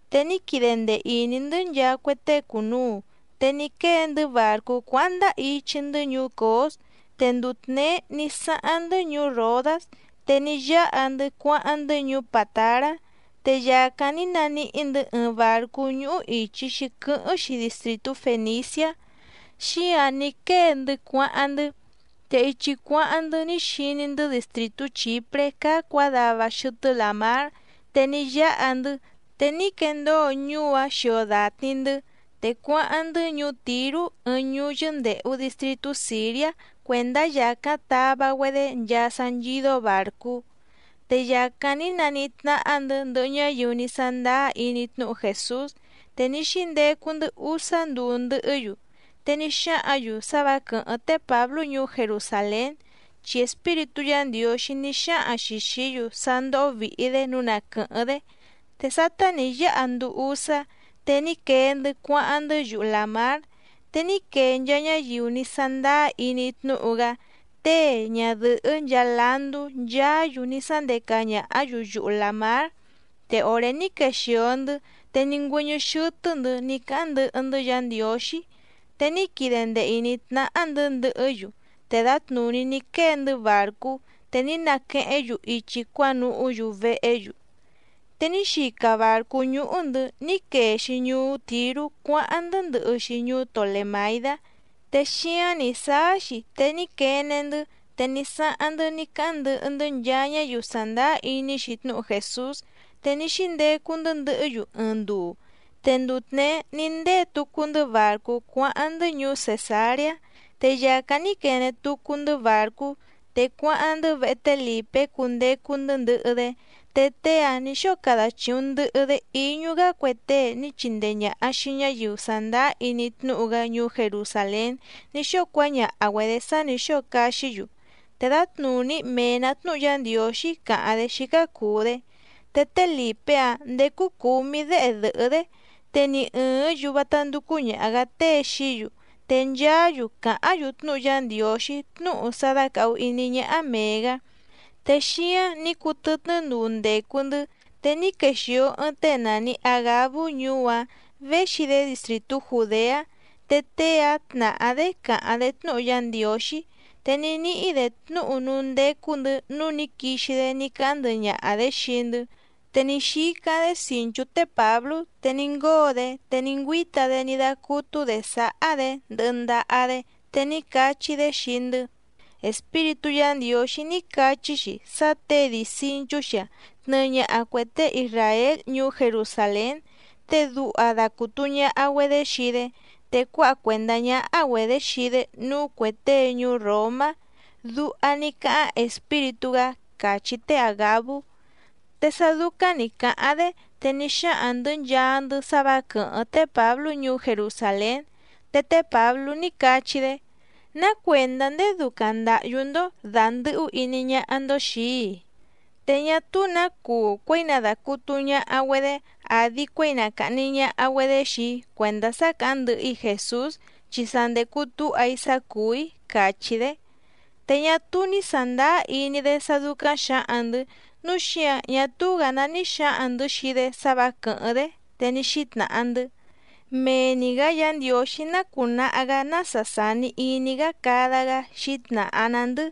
Te ní quide ndee ìní‑ndɨ́ nchaa cue tée cùnuu. Te ní quée‑ndɨ́ bàrcú cuáháⁿ ndáá ichi‑ndɨ́ ñuú Cǒs. Te nduu tněé ní sáháⁿ‑ndɨ́ ñuú Ròdás, te ní yáha‑ndɨ́ cuáháⁿ‑ndɨ́ ñuú Pàtará. Te yàcáⁿ ní naníhí‑ndɨ̌ ɨɨⁿ bàrcú ñúhú ìchi‑xi quɨ́hɨ́ⁿ‑xi distrìtú Fèniciá, xíǎⁿ ní quée‑ndɨ́ cuáháⁿ‑ndɨ́. Te ichi cuáháⁿ‑ndɨ́ ní xiní‑ndɨ́ distrìtú Chìpré cáá cuǎdava xɨtɨ́ làmár, te ní yáha‑ndɨ́, te ní quendóo ñuú‑áⁿ xio dàtni‑ndɨ́. Te cuáháⁿ‑ndɨ́ ñuú Tìrú ɨɨⁿ ñuú yɨ́ndèhu distritú Sìriá cuèndá yàcáⁿ tava‑güedé nchaa sá nchídó bàrcú. Te yàcáⁿ ní naníhí tnáhá‑ndɨ̌ ndɨhɨ ñáyiu ní sándáá iní tnúhu Jèsús, te ní xíndecu‑ndɨ́ úsá nduu ndɨhɨ́‑yu. Te ní xáhǎⁿ‑yu sá vǎ quɨ̀hɨ́ⁿ té Pǎblú ñuú Jerusàlén, chi Espíritú Yǎ Ndiǒxí ní xáhaⁿ‑xi xìí‑yu sá ndóhó vìhi‑dé nǔu na quɨ̀hɨ́ⁿ‑dé. Te sátá nǐ yáha nduu úsá, te ní quee‑ndɨ́ cuáháⁿ‑ndɨ́ yuhu làmár. Te ní quee nchaa ñáyiu ní sándáá iní tnúhu‑gá, tée, ñadɨ̀hɨ́, nchaa landú, nchaá‑yu ní sándeca ñàhá‑yu yuhu làmár, te òré ní quexìo‑ndɨ́, te ní ngüɨ́ñɨ́ xɨ́tɨ́‑ndɨ̌ ní cáháⁿ ndɨhɨ‑ndɨ́ Yǎ Ndiǒxí. Te ní quide ndee ìní tnáhá‑ndɨ̌ ndɨhɨ́‑yu, te dǎtnùní ní quée‑ndɨ́ bàrcú, te ní naquehéⁿ‑yu ichi cuánuhú‑yu vehé‑yu. Te ní xica bàrcú ñúhú‑ndɨ̌ ní quee‑xi ñuú Tìrú cuáháⁿ‑ndɨ́ ndɨhɨ‑xi ñuú Tolèmaidá. Te xíáⁿ nǐ sáá‑xi te ní quene‑ndɨ́, te ní sáháⁿ‑ndɨ́ ní cáháⁿ ndɨhɨ‑ndɨ́ nchaa ñáyiu sàndáá iní‑xi tnúhu Jèsús, te ní xíndecu‑ndɨ́ ndɨhɨ́‑yu ɨɨⁿ nduu. Te nduu tněé ní ndée tucu‑ndɨ́ bàrcú cuáháⁿ‑ndɨ́ ñuú Cèsareá, te yàcáⁿ ní quene tucu‑ndɨ́ bàrcú, te cuáháⁿ‑ndɨ́ vehe té Lìpé cundecu‑ndɨ́ ndɨhɨ‑dé. Te tée‑áⁿ nǐ xóo cada chìuⁿ ndɨhɨ‑dé íñú‑gá cue tée ní chindee ñàha xii ñáyiu sàndáá iní tnúhu‑gá ñuú Jerusàlén ní xóo cuáñaha‑güedě sá nǐ xóo caxí‑yu. Te dǎtnùní mee‑nǎ tnúhu Yá Ndiǒxí càháⁿ‑dé xícá cùu‑dé. Te té Lìpé‑áⁿ ndècu cúmí děhe dɨ̀hɨ́‑dé, te ni ɨ̀ɨ́ⁿ‑yu vátá ndúcú ñàha‑gá tée xií‑yu, te nchaá‑yu càháⁿ‑yu tnúhu Yá Ndiǒxí tnúhu sá dácàhu iní ñáhá mèe‑gá. Te xíáⁿ nǐ cuu tɨtnɨ́ nduu ndècu‑ndɨ́, te ní quexìo ɨɨⁿ tée nàni Agabú ñuú‑áⁿ, véxi‑dé distrìtú Jùdeá, te tée‑áⁿ tnàhá‑dé càháⁿ‑dé tnúhu Yá Ndiǒxí. Te ní níhí‑dě tnúhu núú ndécú‑ndɨ̌ nǔu ní quixi‑dé ní cáháⁿ ndɨhɨ ñaha‑dě xii‑ndɨ́. Te ní xícáⁿ‑dé cìnchú té Pǎblú, te ní ngóo‑dé, te ní ngüíta‑dé ní dácútú‑dě sáhá‑dě ndɨhɨ ndaha‑dé, te ní cachí‑dé xii‑ndɨ́: —Espíritú Yǎ Ndiǒxí ní cachí‑xi sá těe dii cìnchú‑xi‑a tnɨɨ ñaha cuè tée isràél ñuú Jerusàlén, te duha dacùtu ñaha‑güedé xii‑dé, te cuáha cuèndá ñáhá‑güedě xii‑dé núú cuè tée ñuú Ròmá. Duha ní cáháⁿ Espíritú‑gá —càchí té Àgabú. Te sá dúcáⁿ nǐ cáháⁿ‑dé, te ní xáhaⁿ‑ndɨ̌ nchaa‑ndɨ́ sá vǎ quɨ̀hɨ́ⁿ té Pǎblú ñuú Jerusàlén. Te té Pǎblú ní cachí‑dé: —¿Ná cuèndá ndéé dúcáⁿ ndàhyú‑ndó dàndɨhú iní ñáhá‑ndó xìi‑í‑i? Te ñá túú nǎ cuu cuěi na dàcutu ñaha‑güedé, àdi cuéi na càhni ñaha‑güedé xii‑í cuèndá sá càháⁿ ndɨhɨ‑í Jèsús, chi sa ndècu túha‑í sá cùú‑í —càchí‑dé. Te ñá túú ní sàndáá iní‑dé sá dúcáⁿ xǎhaⁿ‑ndɨ̌, núu xíǎⁿ ñá túú‑gǎ ná ní xǎhaⁿ‑ndɨ̌ xii‑dé sá vǎ quɨ̀hɨ́ⁿ‑dé, te ní xítnàha‑ndɨ́: —Mee‑ni‑gǎ Yǎ Ndiǒxí ná cùnaha‑gá nása sàni iní‑gá cada‑gá —xǐtnàha‑na‑ndɨ́.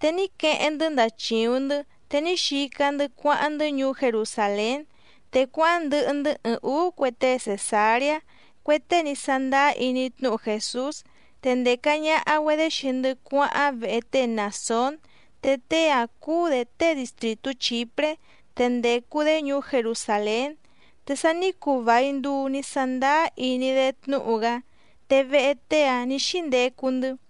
Te ní queheⁿ‑ndɨ́ ndàchiuⁿ‑ndɨ́, te ní xica‑ndɨ́ cuáháⁿ‑ndɨ́ ñuú Jerusàlén. Te cuáháⁿ ndɨhɨ‑ndɨ́ ɨɨⁿ ǔú cue tée Cèsareá, cue tée ní sándáá iní tnúhu Jèsús. Te ndèca ñaha‑güedé xii‑ndɨ́ cuáháⁿ vehe té Mnàsón, te tée‑áⁿ cúú‑dě tée distrìtú Chìpré, te ndècu‑dé ñuú Jerusàlén, te sa ní cuu vài nduu ní sándáá iní‑dé tnúhu‑gá, te vehe tée‑áⁿ nǐ xíndecu‑ndɨ́.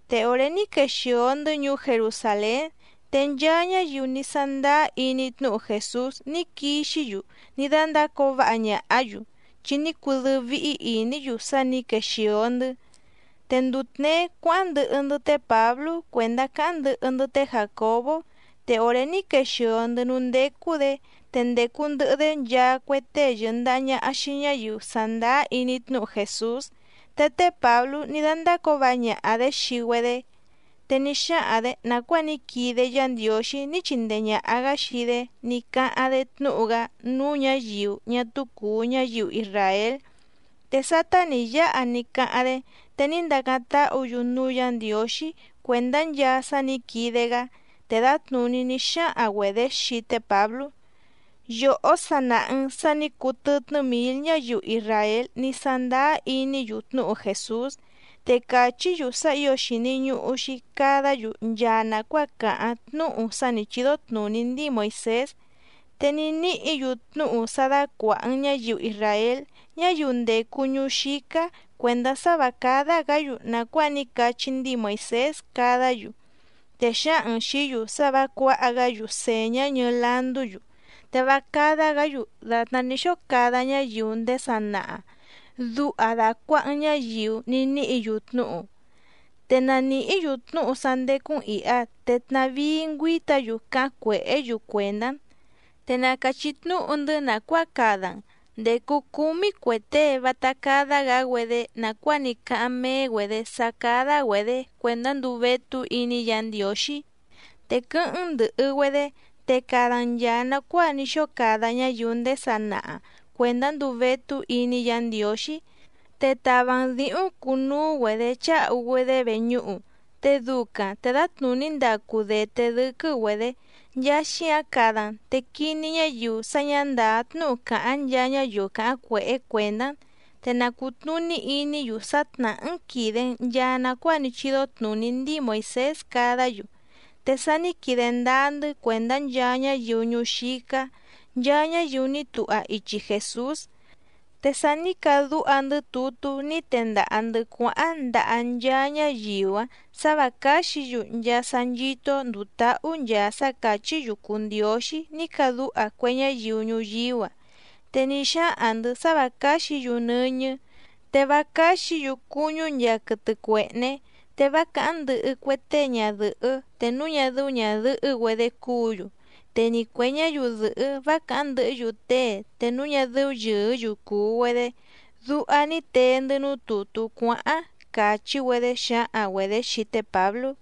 Te òré ní quexìo‑ndɨ́ ñuú Jerusàlén, te nchaa ñáyiu ní sándáá iní tnúhu Jèsús ní quixí‑yu ní dándácǒo váha ñàhá‑yu, chi ní cudɨ́ɨ́ víhí ìní‑yu sá nǐ quexìo‑ndɨ́. Te nduu tněé cuáháⁿ ndɨhɨ‑ndɨ́ té Pǎblú cuèndá cáháⁿ ndɨhɨ‑ndɨ́ té Jàcobó, te òré ní quexìo‑ndɨ́ núú ndécú‑dě, te ndècu ndɨhɨ‑dé nchaa cue tée yɨ̀ndaha ñaha xii ñáyiu sàndáá iní tnúhu Jèsús. Te té Pǎblú ní dándácǒo váha ñaha‑dě xii‑güedé, te ní xáhaⁿ‑dě nàcuáa ní quide Yá Ndiǒxí ní chindee ñàha‑gá xii‑dé ní cáháⁿ‑dé tnúhu‑gá núú ñǎyiu ñá túú cùu ñáyiu isràél. Te sátá nǐ yáha ní cáháⁿ‑dé, te ní ndácáⁿ táhǔ‑yu núú Yǎ Ndiǒxí cuèndá nchaa sá nǐ quide‑gá. Te dǎtnùní ní xáhaⁿ‑güedě xii té Pǎblú: —Yòhó sa nàha‑n sá nǐ cuu tɨtnɨ́ mǐl ñáyiu isràél ní sándáá iní‑yu tnúhu Jèsús, te càchí‑yu sá ǐo xìni ñuhu‑xi cadá‑yu nchaa nàcuáa càháⁿ tnúhu sá nǐ chídó tnùní ndíi Moìsés. Te ní níhǐ‑yu tnúhu sá dácuàha‑n ñáyiu isràél ñáyiu ndècu ñuú xícá cuèndá sá vǎ cádá‑gǎ‑yu nàcuáa ní cachí ndíi Moìsés cadá‑yu. Te xǎhaⁿ‑n xìí‑yu sá vǎ cuǎha‑gá‑yu sèñá ñɨɨ landú‑yu, te vá cádá‑gǎ‑yu dàtná ní xóo cada ñáyiu ndéé sanaha, duha dàcuaha‑n ñáyiu ní níhǐ‑yu tnúhu. Te na nìhí‑yu tnúhu sá ndécú‑n ìha, te tnàvíí ngüíta‑yu cáháⁿ cuèhé‑yu cuèndá‑n. Te na càchí tnúhu‑ndɨ́ nàcuáa cada‑n. Ndècu cúmí cue tée vátá cádá‑gǎ‑güedé nàcuáa ní cáháⁿ méé‑güedě sá cádá‑güedě cuèndá nduu vétú iní Yǎ Ndiǒxí. Te quɨ́hɨ́ⁿ‑n ndɨ̀hɨ‑güedé te cada‑n nchàa nacuáa ní xóo cada ñáyiu ndéé sanaha cuèndá nduu vétú iní Yǎ Ndiǒxí. Te tava‑n dǐhúⁿ cuu núú‑güedě cháhu‑güedé veñúhu, te ducaⁿ te dǎtnùní ndacu dèté dɨ́quɨ́‑güedě. Nchaa xíǎⁿ cada‑n, te quiní ñáyiu sá ñǎ ndàá tnúhu càháⁿ nchaa ñáyiu càháⁿ cuèhé cuèndá‑n. Te na cùtnuní iní‑yu sá tnàhá‑n quìde‑n nchaa nacuáa ní chídó tnùní ndíi Moìsés cadá‑yu. Te sa ní quide ndáá‑ndɨ́ cuèndá nchaa ñáyiu ñuú xícá, nchaa ñáyiu ní tuha ichi Jèsús. Te sa ní cadúha‑ndɨ́ tutú ní tendaha‑ndɨ̌ cuáháⁿ ndaha nchaa ñáyiu‑áⁿ sǎ vǎ cáxǐ‑yu nchaa sá nchító‑ó ndùu táhú nchaa sá càchí‑yu cùu ndióxí ní cadúha cue ñáyiu ñuyíú‑a. Te ní xáhaⁿ‑ndɨ̌ sá vǎ cáxǐ‑yu nɨ́ñɨ́, te vá cáxǐ‑yu cuñú nchaa quɨtɨ cuèhné. Te vá càháⁿ ndɨhɨ cue tée ñadɨ̀hɨ́ te núu ñá dɨ́ú ñàdɨhɨ́‑güedé cúǔ‑yu, te ni cuè ñáyiu dɨ̀hɨ́ vá càháⁿ ndɨhɨ́‑yu tée te núu ñá dɨ́ú yɨ̀ɨ́‑yu cùu‑güedé. Duha ní tee‑ndɨ́ núú tùtú cuáháⁿ —càchí‑güedé xǎhaⁿ‑güedě xii té Pǎblú.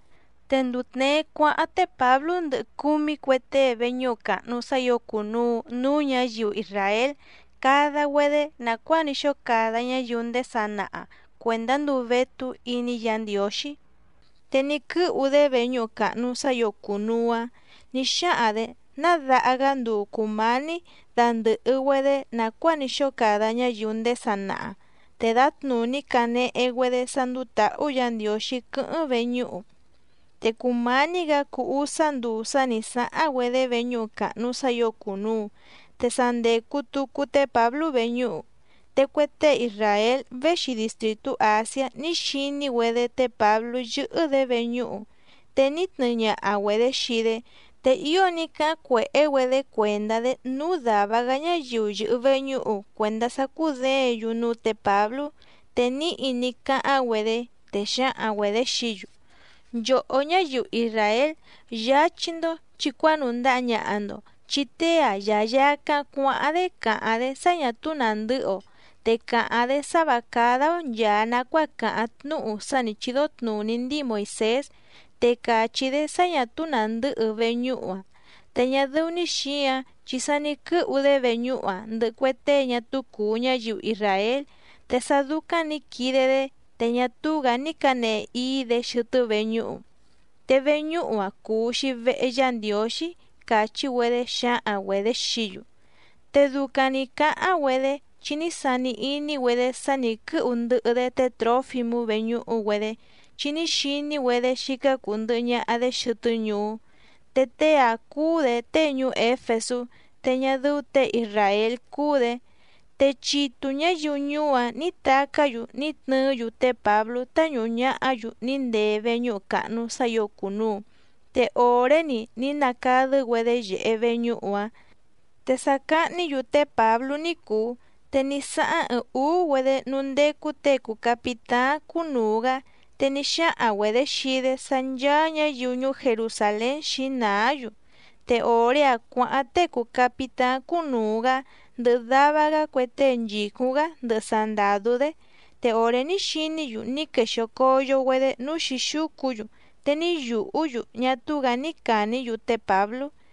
Te nduu tněé cuáháⁿ té Pǎblú ndɨhɨ cúmí cue tée veñúhu càhnu sá ǐo cùnuu núú ñǎyiu isràél cada‑güedé nàcuáa ní xóo cada ñáyiu ndéé sanaha cuèndá nduu vétú iní Yǎ Ndiǒxí. Te ní quɨ́hu‑dé veñúhu càhnu sá ǐo cùnuu‑áⁿ nǐ xáhaⁿ‑dě ná daha‑gá nduu cùmání dandɨ̀hɨ‑güedé nàcuáa ní xóo cada ñáyiu ndéé sanaha, te dǎtnùní cànehe‑güedé sá ndúú tǎhú Yǎ Ndiǒxí quɨ́hɨ́ⁿ veñúhu. Te cùmání‑gǎ cuu úsá nduu sá nǐ sáháⁿ‑güedé veñúhu càhnu sá ǐo cùnuu, te sa ndècu tucu té Pǎblú veñúhu. Te cue tée isràél véxi distrìtú Àsiá ní xiní‑güedé té Pǎblú yɨ́hɨ́‑dě veñúhu, te ní tnɨɨ ñaha‑güedě xii‑dé, te ío ní cáháⁿ cuèhé‑güedé cuèndá‑dé núú dàva‑gá ñáyiu yɨ̀hɨ veñúhu cuèndá sá cúděěⁿ‑yu núú tě Pǎblú. Te níhi ní cáháⁿ‑güedé, te xǎhaⁿ‑güedě xií‑yu: —¡Nchòhó ñáyiu isràél, yáchí‑ndó chì cuánùndaha ñaha‑ndo! Chi tée‑a yayàcáⁿ cuáháⁿ‑dé càháⁿ‑dé sá ñà túú nàndɨ́hɨ‑o, te càháⁿ‑dé sá vǎ cádá‑ó nchàa nacuáa càháⁿ tnúhu sá nǐ chídó tnùní ndíi Moìsés, te càchí‑dé sá ñà túú nàndɨ́hɨ veñúhu‑a. Te ñá dɨ́ú‑ní xǐǎⁿ chi sa ní quɨ́hu‑dé veñúhu‑a ndɨhɨ cue tée ñá túú cùu ñáyiu isràél, te sá dúcáⁿ nǐ quide‑dé, te ñá túú‑gǎ ní cǎnehe íí‑dě xɨtɨ́ veñúhu. Te veñúhu‑a cùu‑xi vehe Yá Ndiǒxí —càchí‑güedé xǎhaⁿ‑güedě xií‑yu. Te ducaⁿ nǐ cáháⁿ‑güedé chi ní sani iní‑güedé sá nǐ quɨ́hu ndɨhɨ‑dé té Trǒfimú veñúhu‑güedé, chi ní xiní‑güedé xícá cùu ndɨhɨ ñaha‑dé xɨtɨ́ ñuú. Te tée‑áⁿ cúú‑dě tée ñuú Éfesú, te ñá dɨ́ú těe isràél cúú‑dě. Te chitu ñǎyiu ñuú‑áⁿ nǐ tacá‑yu ní tnɨɨ́‑yu té Pǎblú táñùhu ñahá‑yu ní ndee veñúhu càhnu sá ǐo cùnuu, te òré‑ni ní nacadɨ́‑güedé yèhe veñúhu‑áⁿ. Te sa cahní‑yu té Pǎblú ní cùu, te ní sáháⁿ ɨɨⁿ ǔú‑güedé núú ndécú těe cùu capitáⁿ cúnùu‑gá, te ní xáhaⁿ‑güedě xii‑dé sá ncháá ñǎyiu ñuú Jerusàlén xǐnàá‑yu. Te òré‑áⁿ cuǎháⁿ tée cùu capitáⁿ cúnùu‑gá ndɨhɨ dava‑gá cue tée nchìcúⁿ‑gá ndɨhɨ sandàdú‑dé. Te òré ní xiní‑yu ní quexìo coyo‑güedé núú xǐxúcu‑yu, te ní yùhú‑yu ñá túú‑gǎ ní càní‑yu té Pǎblú.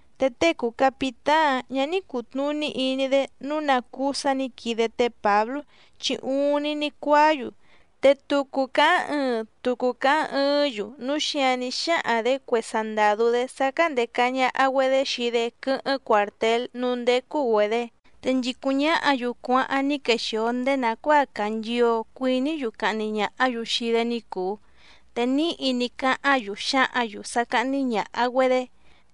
Te tée cùu capitáⁿ‑áⁿ ñǎ ní cùtnuní iní‑dé nǔu ná cúú sǎ nǐ quide té Pǎblú, chi uuⁿni ní cuáá‑yu. Te tucu càháⁿ ɨɨⁿ, tucu càháⁿ ɨɨ́ⁿ‑yu, núu xíǎⁿ ní xáhaⁿ‑dě cue sandàdú‑dé sá cándèca ñaha‑güedé xii‑dé quɨ́hɨ́ⁿ cuàrtél núú ndécú‑güedě. Te nchìcúⁿ ñáhǎ‑yu cuáháⁿ ní quexìo ndéé nàcuáa càa nchio cuìní‑yu cahni ñàhá‑yu xii‑dé ni cùu. Te níhi ní cáháⁿ‑yu xǎhǎⁿ‑yu sá cáhní ñàha‑güedé,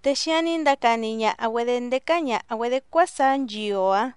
te xíǎⁿ ní ndacani ñaha‑güedě ndécá ñàha‑güedé cuásaá nchio‑ǎⁿ.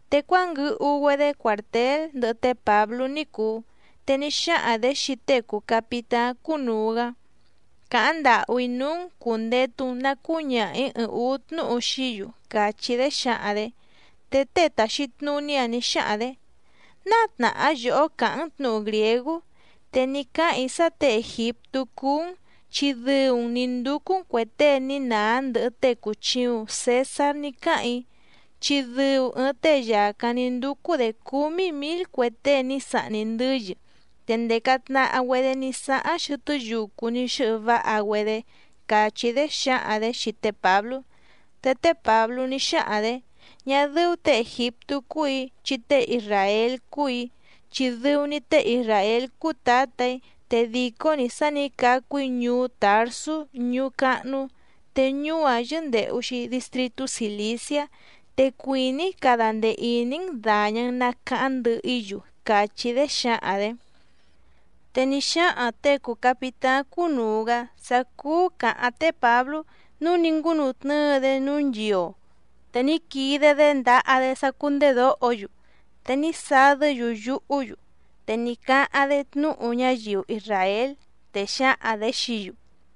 Te cuánguɨhu‑güedé cuàrtél ndɨhɨ té Pǎblú ní cùu, te ní xáhaⁿ‑dě xii tée cùu capitáⁿ cúnùu‑gá: —Càháⁿ ndàhú‑í núú‑n cùndetu‑n na cúñaha‑ǐ ɨɨⁿ ǔú tnúhu xií‑yu —càchí‑dé xǎhaⁿ‑dě. Te tée tàxi tnuní‑áⁿ nǐ xáhaⁿ‑dě: —¿Náa tnàhá yòhó càháⁿ‑n tnǔhu grìégú? Te ní cáhàⁿ‑í sá těe ègiptú cúú‑n, chi dɨu‑n nǐ ndúcú‑n cuè tée ní nàá ndɨhɨ tée cùchiuⁿ Cesár ní cáhàⁿ‑í, chi dɨu ɨɨⁿ tée yàcáⁿ ní ndúcú‑dě cúmí mǐl cue tée ní sahni ndɨ́yɨ. Te ndèca tnaha‑güedé ní sáháⁿ xɨtɨ́ yucu ní xɨ́hɨ váha‑güedé —càchí‑dé xǎhaⁿ‑dě xii té Pǎblú. Te té Pǎblú ní xáhaⁿ‑dě: —Ñá dɨ́ú těe ègiptú cúù‑í, chi tée isràél cúù‑í, chi dɨu‑ni tée isràél cúú tǎtà‑í, te dìcó‑ni sá nǐ cacu‑í ñuú Tàrsú ñuú cáhnú, te ñuú‑áⁿ yɨ́ndèhu‑xi distritú Cìliciá. Te cuìní‑í cada ndee ìní‑n dàña‑n na caháⁿ ndɨhɨ‑í‑yu —càchí‑dé xǎhaⁿ‑dě. Te ní xáhaⁿ těe cùu capitáⁿ cúnùu‑gá sá cúú cǎháⁿ té Pǎblú, núu ní ngúnutnɨ́ɨ‑dé núú nchio, te ní quide‑dé ndaha‑dé sá cúndèdóho‑yu. Te ní sadɨ́‑yu yuhú‑yu, te ní cáháⁿ‑dé tnúhu ñáyiu isràél, te xǎhaⁿ‑dě xií‑yu: